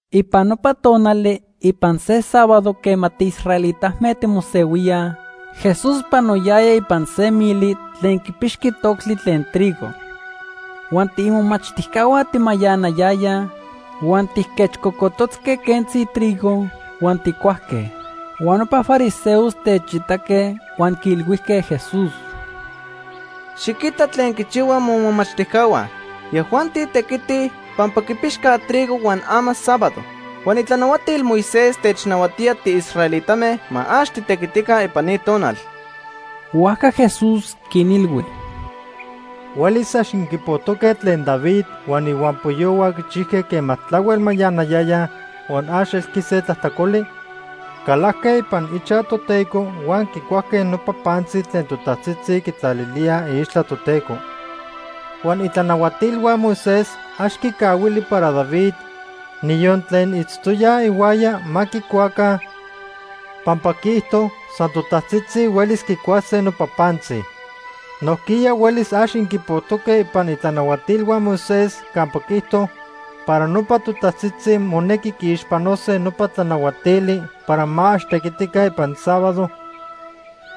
Ipan nopa tonali, ipan se sábado quema tiisraelitame timosehuíaj, Jesús panoyaya ipan se mili tlen quipixqui toctli tlen trigo. Huan tiimomachtijcahua timayanayayaj huan tijquechcocototzque quentzi trigo huan tijcuajque. Huan nopa fariseos techitaque huan quiilhuijque Jesús: ―Xiquita tlen quichihuaj momachtijcahua. Yajuanti tequitij, pampa quipixcaj trigo huan ama sábado. Huan itlanahuatil Moisés technahuatíaj tiisraelitame ma ax titequitica ipan ni tonal. Huajca Jesús quinilhui: ―Huelis ax inquipojtoque tlen David huan ihuampoyohua quichijque quema tlahuel mayanayayaj huan ax elqui se tlajtlacoli. Calajque ipan ichaj Toteco huan quicuajque nopa pantzi tlen totajtzitzi quitlalilíaj iixtla Toteco. Huan itlanahuatilhua Moisés ax quicahuili para David, niyon tlen itztoyaj ihuaya ma quicuaca, pampa quiijto san totajtzitzi huelis quicuase nopa pantzi. Nojquiya huelis ax inquipojtoque ipan itlanahuatilhua Moisés campa quiijto para nopa totajtzitzi monequi quiixpanose nopa tlanahuatili para ma ax tequitica ipan sábado,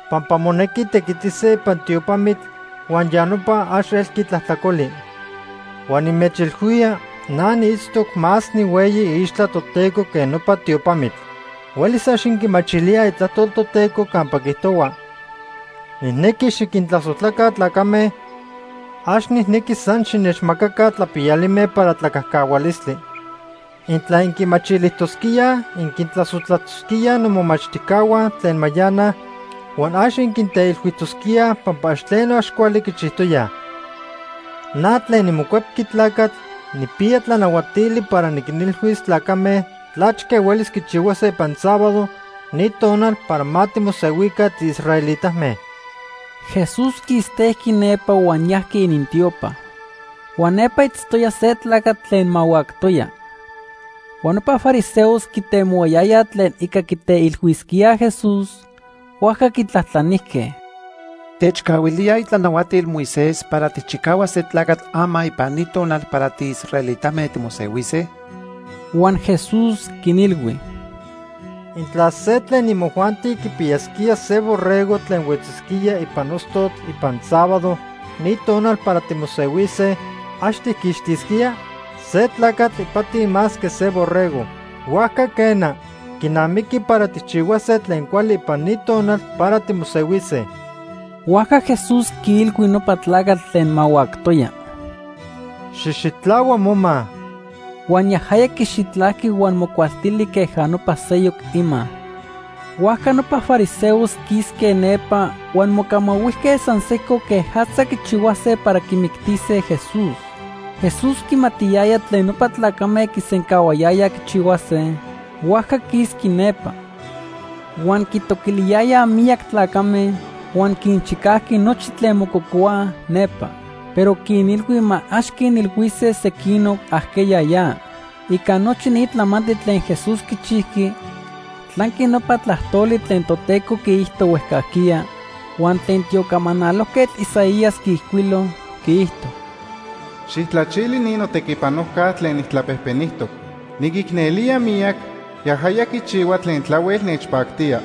pampa monequi tequitise ipan tiopamitl huan ya nopa ax elqui tlajtlacoli. Huan nimechilhuía na niitztoc más nihueyi iixtla Toteco que nopa tiopamitl. Huelis ax inquimachilíaj Itlajtol Toteco campa quiijtohua: ‘Nijnequi xiquintlasojtlaca tlacame, ax nijnequi san xinechmacaca tlapiyalime para tlacajcahualistli.’ Intla inquimachilijtosquíaj, inquintlasojtlatosquíaj nomomachtijcahua tlen mayanaj, huan ax inquinteilhuijtosquíaj pampa ax tleno ax cuali quichijtoyaj. Na tlen niMocuepqui Tlacatl nijpiya tlanahuatili para niquinilhuis tlacame tlachque huelis quichihuase ipan sábado, ni tonal para ma timosehuica tiisraelitame. Jesús quistejqui nepa huan yajqui inintiopa. Huan nepa itztoya se tlacatl tlen mahuactoya. Huan nopa fariseos quitemohuayayaj tlen ica quiteilhuisquíaj Jesús, huajca quitlajtlanijque: ―¿Techcahuilíaj itlanahuatil Moisés para tijchicahuas se tlacatl ama ipan ni tonal para tiisraelitame timosehuise? Huan Jesús quinilhui: ―Intla se tlen imojuanti quipiyasquía se borrego tlen huetzisquía ipan ostotl ipan sábado, ni tonal para timosehuise, ¿ax tijquixtisquía? Se tlacatl ipati más que se borrego. Huajca quena, quinamiqui para tijchihuase tlen cuali ipan ni tonal para timosehuise. Huajca Jesús quiilhui nopa tlacatl tlen mahuactoya: ―Xijxitlahua moma. Huan yajaya quixitlajqui huan mocualtili queja nopa seyoc ima. Huajca nopa fariseos quisque nepa huan mocamahuijque san sejco quejatza quichihuase para quimictise Jesús. Jesús quimatiyaya tlen nopa tlacame quisencahuayayaj quichihuase, huajca quisqui nepa. Huan quitoquiliyayaj miyac tlacame, huan quinchicajqui nochi tlen mococohuaj nepa. Pero quinilhui ma ax quinilhuise sequinoc ajqueya ya. Ica nochi ni tlamantli tlen Jesús quichijqui tlanqui nopa tlajtoli tlen Toteco quiijto huejcajquiya huan tlen tiocamanalojquetl Isaías quiijcuilo. Quiijto: “Xijtlachili ni notequipanojca tlen nijtlapejpenijtoc. Niquicnelía miyac, yajaya quichihua tlen tlahuel nechpactía.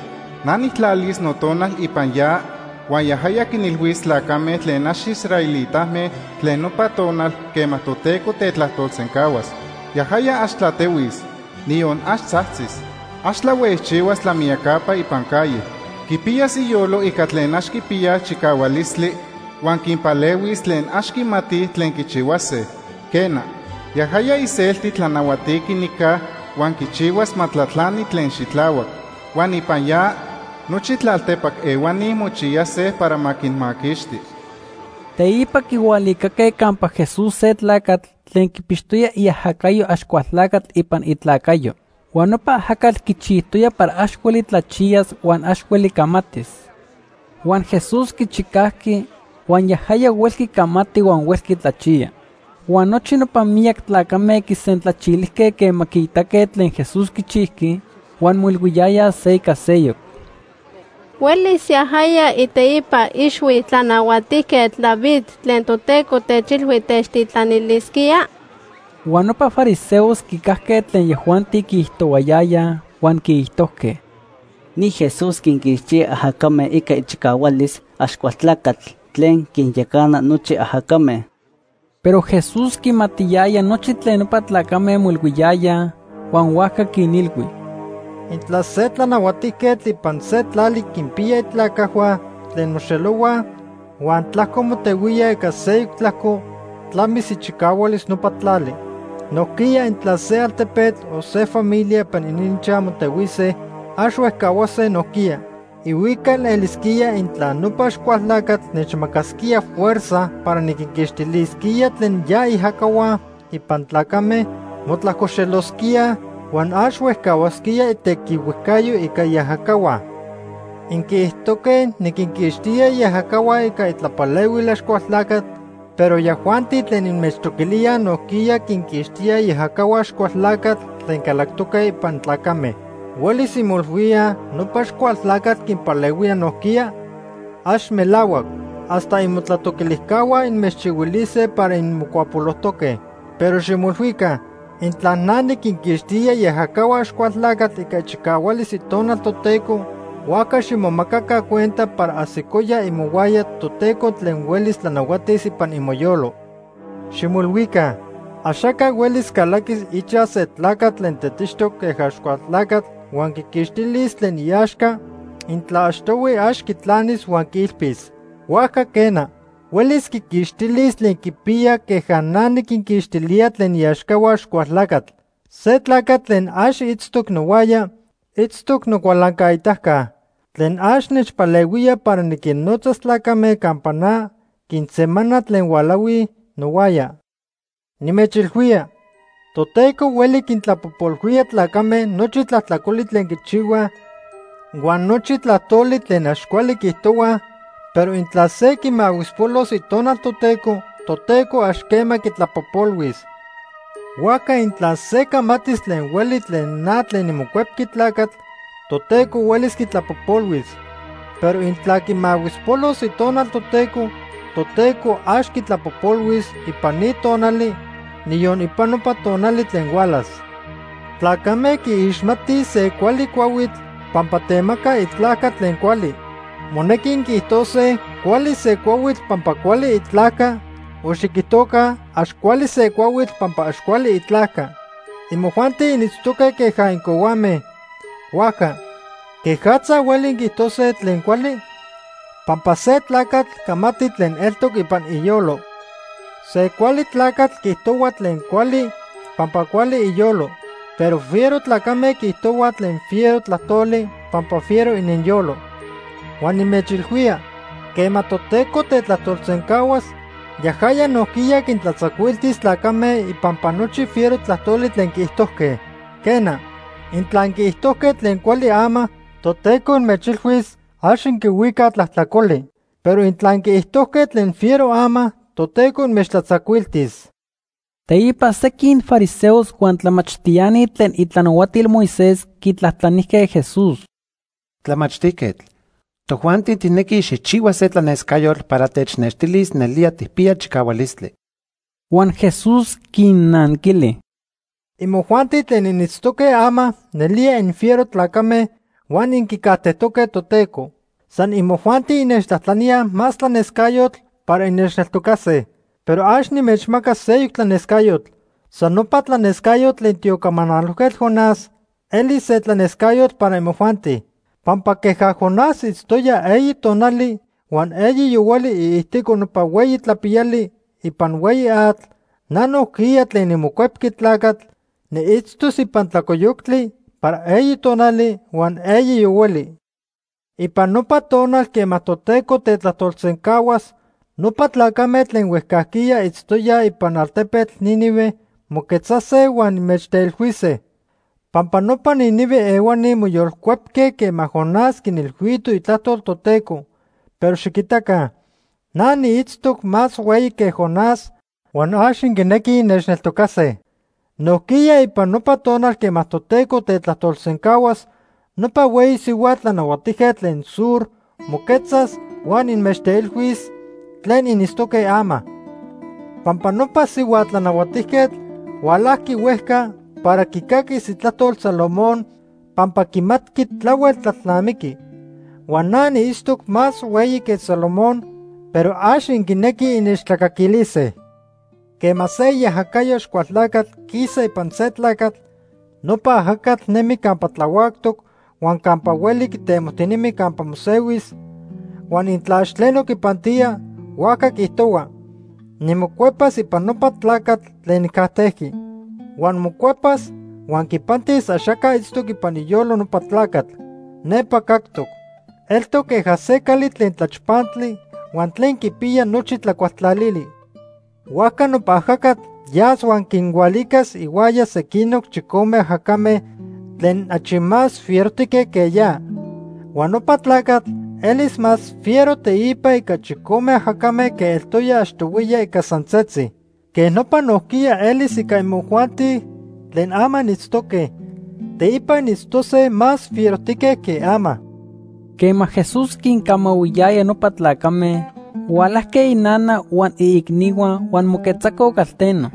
Na nijtlalis Notonal ipan ya, huan yajaya quinilhuis tlacame tlen ax israelitame tlen nopa tonal quema Toteco tetlajtolsencahuas. Yajaya ax tlatehuis, niyon ax tzajtzis. Ax tlahuejchihuas tlamiyacapa ipan calle. Quipiyas iyolo ica tlen ax quipiyaj chicahualistli, huan quinpalehuis tlen ax quimatij tlen quichihuase. Quena, yajaya iselti tlanahuatiqui nica huan quichihuas ma tlatlani tlen xitlahuac. Huan ipan ya, nochi tlaltepac ehuani mochiyase para ma quinmaquixti.” Teipa quihualicaque campa Jesús se tlacatl tlen quipixtoya iajacayo Axcualtlacatl ipan itlacayo. Huan nopa ajacatl quichijtoya para ax hueli tlachiyas huan ax hueli camatis. Huan Jesús quichicajqui huan yajaya huelqui camati huan huelqui tlachiya. Huan nochi nopa miyac tlacame quisentlachilijque quema quiitaque tlen Jesús quichijqui huan moilhuiyayaj se ica seyoc: “¿Huelis yajaya iteipa ixhui Tlanahuatijquetl David tlen Toteco techilhui techtitlanilisquía?” Huan nopa fariseos quicajque tlen yajuanti quiijtohuayayaj huan quiijtojque: “Ni Jesús quinquixtía ajacame ica ichicahualis Axcualtlacatl tlen quinyacana nochi ajacame.” Pero Jesús quimatiyaya nochi tlen nopa tlacame moilhuiyayaj, huan huajca quinilhui: “Intla se tlanahuatijquetl ipan se tlali quinpiya itlacajhua tlen moxelohuaj huan tlajco motehuíaj ica seyoc tlajco, tlamis ichicahualis nopa tlali. Nojquiya intla se altepetl o se familia ipan ininchaj motehuise, ax huejcahuase nojquiya. Ihuical elisquía intla nopa Axcualtlacatl nechmacasquía fuerza para niquinquixtilisquía tlen ya iajacahua ipan tlacame, motlajcoxelosquía huan ax huejcahuasquía itequihuejcayo ica iajacahua. Inquiijtojque niquinquixtía iajacahua ica itlapalehuil Axcualtlacatl, pero yajuanti tlen inmechtoquilíaj nojquiya quinquixtíaj iajacahua Axcualtlacatl tlen calactoque ipan tlacame. ¿Huelis inmoilhuíaj nopa Axcualtlacatl quinpalehuía nojquiya? ¡Ax melahuac! Hasta imotlatoquilijcahua inmechilhuise para inmocuapolojtoque. Pero ximoilhuica. Intla na niquinquixtía iajacahua Axcualtlacatl ica ichicahualis Itonal Toteco, huajca ximomacaca cuenta para ajsicoya imohuaya Toteco tlen huelis tlanahuatis ipan imoyolo. “Ximoilhuica, axaca huelis calaquis ichaj se tlacatl tlen tetixtoc queja Axcualtlacatl huan quiquixtilis tlen iaxca intla achtohui ax quitlanis huan quiilpis. Huajca quena, huelis quiquixtilis tlen quipiya queja na niquinquixtilía tlen iaxcahua Axcualtlacatl. “Se tlacatl tlen ax itztoc nohuaya, itztoc nocualancaitaca. Tlen ax nechpalehuía para niquinnotzas tlacame campa na, quinsemana tlen hualahuij nohuaya. “Nimechilhuía, Toteco hueli quintlapojpolhuía tlacame nochi tlajtlacoli tlen quichihuaj huan nochi tlajtoli tlen ax cuali quiijtohuaj, pero intla se quimahuispolos Itonal Toteco, Toteco ax quema quitlapojpolhuis. Huajca intla se camatis tlen hueli tlen na tlen niMocuepqui Tlacatl, Toteco huelis quitlapojpolhuis, pero intla quimahuispolos Itonal Toteco, Toteco ax quitlapojpolhuis ipan ni tonali, niyon ipan nopa tonali tlen hualas. “Tlacame quiixmatij se cuali cuahuitl pampa temaca itlajca tlen cuali. Monequi inquiijtose cuali se cuahuitl pampa cuali itlajca o xiquijtoca ax cuali se cuahuitl pampa ax cuali itlajca. Imojuanti initztoque queja incohuame, huajca ¿quejatza hueli inquiijtose tlen cuali? Pampa se tlacatl camati tlen eltoc ipan iyolo. Se cuali tlacatl quiijtohua tlen cuali pampa cuali iyolo, pero fiero tlacame quiijtohuaj tlen fiero tlajtoli pampa fiero ininyolo. Huan nimechilhuía, quema Toteco tetlajtolsencahuas, yajaya nojquiya quintlatzacuiltis tlacame ipampa nochi fiero tlajtoli tlen quiijtojque. Quena, intla inquiijtojque tlen cuali ama, Toteco inmechilhuis ax inquihuicaj tlajtlacoli. Pero intla inquiijtojque tlen fiero ama, Toteco inmechtlatzacuiltis.” Teipa sequin fariseos huan tlamachtiani tlen itlanahuatil Moisés quitlajtlanijque Jesús: ―Tlamachtijquetl, tojuanti tijnequij xijchihua se tlanescayotl para technextilis nelía tijpiya chicahualistli. Huan Jesús quinnanquili: ―Imojuanti tlen initztoque ama, nelía infiero tlacame huan inquicajtejtoque Toteco. San imojuanti innechtlajtlaníaj más tlanescayotl para innechneltocase. Pero ax nimechmacas seyoc tlanescayotl. San nopa tlanescayotl tlen tiocamanalojquetl Jonás elis se tlanescayotl para imojuanti. Pampa queja Jonás itztoya eyi tonali huan eyi yohuali iijtico nopa hueyi tlapiyali ipan hueyi atl, na nojquiya tlen niMocuepqui Tlacatl, niitztos ipan tlalcoyoctli para eyi tonali huan eyi yohuali. Ipan nopa tonal quema Toteco tetlajtolsencahuas, nopa tlacame tlen huejcajquiya itztoyaj ipan altepetl Nínive moquetzase huan inmechteilhuise. Pampa nopa Nínive ehuani moyolcuepque quema Jonás quinilhuito itlajtol Toteco, pero xiquitaca, na niitztoc más hueyi que Jonás huan ax inquinequij innechneltocase. Nojquiya ipan nopa tonal quema Toteco tetlajtolsencahuas, nopa hueyi sihua tlanahuatijquetl tlen Sur moquetzas huan inmechteilhuis tlen initztoque ama. Pampa nopa sihua tlanahuatijquetl hualajqui huejca para quicaquis itlajtol Salomón pampa quimatqui tlahuel tlalnamiqui. Huan na niitztoc más hueyi que Salomón, pero ax inquinequij innechtlacaquilise. “Quema se iajacayo Axcualtlacatl quisa ipan se tlacatl, nopa ajacatl nemi campa tlahuactoc huan campa hueli quitemojtinemi campa mosehuis, huan intla ax tleno quipantía, huajca quiijtohua: ‘Nimocuepas ipan nopa tlacatl tlen nijcajtejqui.’ Huan mocuepas huan quipantis axaca itztoc ipan iyolo nopa tlacatl. Nepa cactoc. Eltoc queja se cali tlen tlachpantli huan tlen quipiya nochi tlacualtlalili. Huajca nopa ajacatl yas huan quinhualicas ihuaya sequinoc chicome ajacame tlen achi más fierojtique que ya. Huan nopa tlacatl elis más fiero teipa ica chicome ajacame que eltoya achtohuiya ica san setzi. Quej nopa nojquiya elis ica imojuanti tlen ama initztoque, teipa initztose más fierojtique que ama.” Quema Jesús quincamahuiyaya nopa tlacame, hualajque inana huan iicnihua huan moquetzacoj calteno.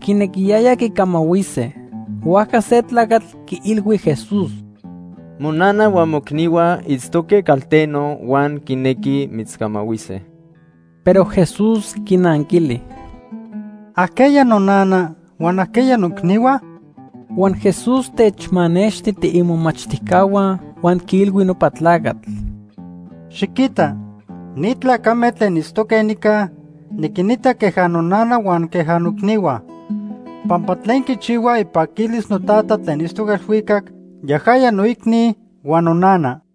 Quinequiyayaj quicamahuise. Huajca se tlacatl quiilhui Jesús: ―Monana huan moicnihua itztoque calteno huan quinequij mitzcamahuise. Pero Jesús quinanquili: ―¿Ajqueya nonana?, huan ¿ajqueya noicnihua? Huan Jesús techmanexti tiimomachtijcahua huan quiilhui nopa tlacatl: ―Xiquita, ni tlacame tlen itztoque nica niquinita queja nonana huan queja noicnihua. Pampa tlen quichihua ipaquilis noTata tlen itztoc elhuicac, yajaya noicni huan nonana.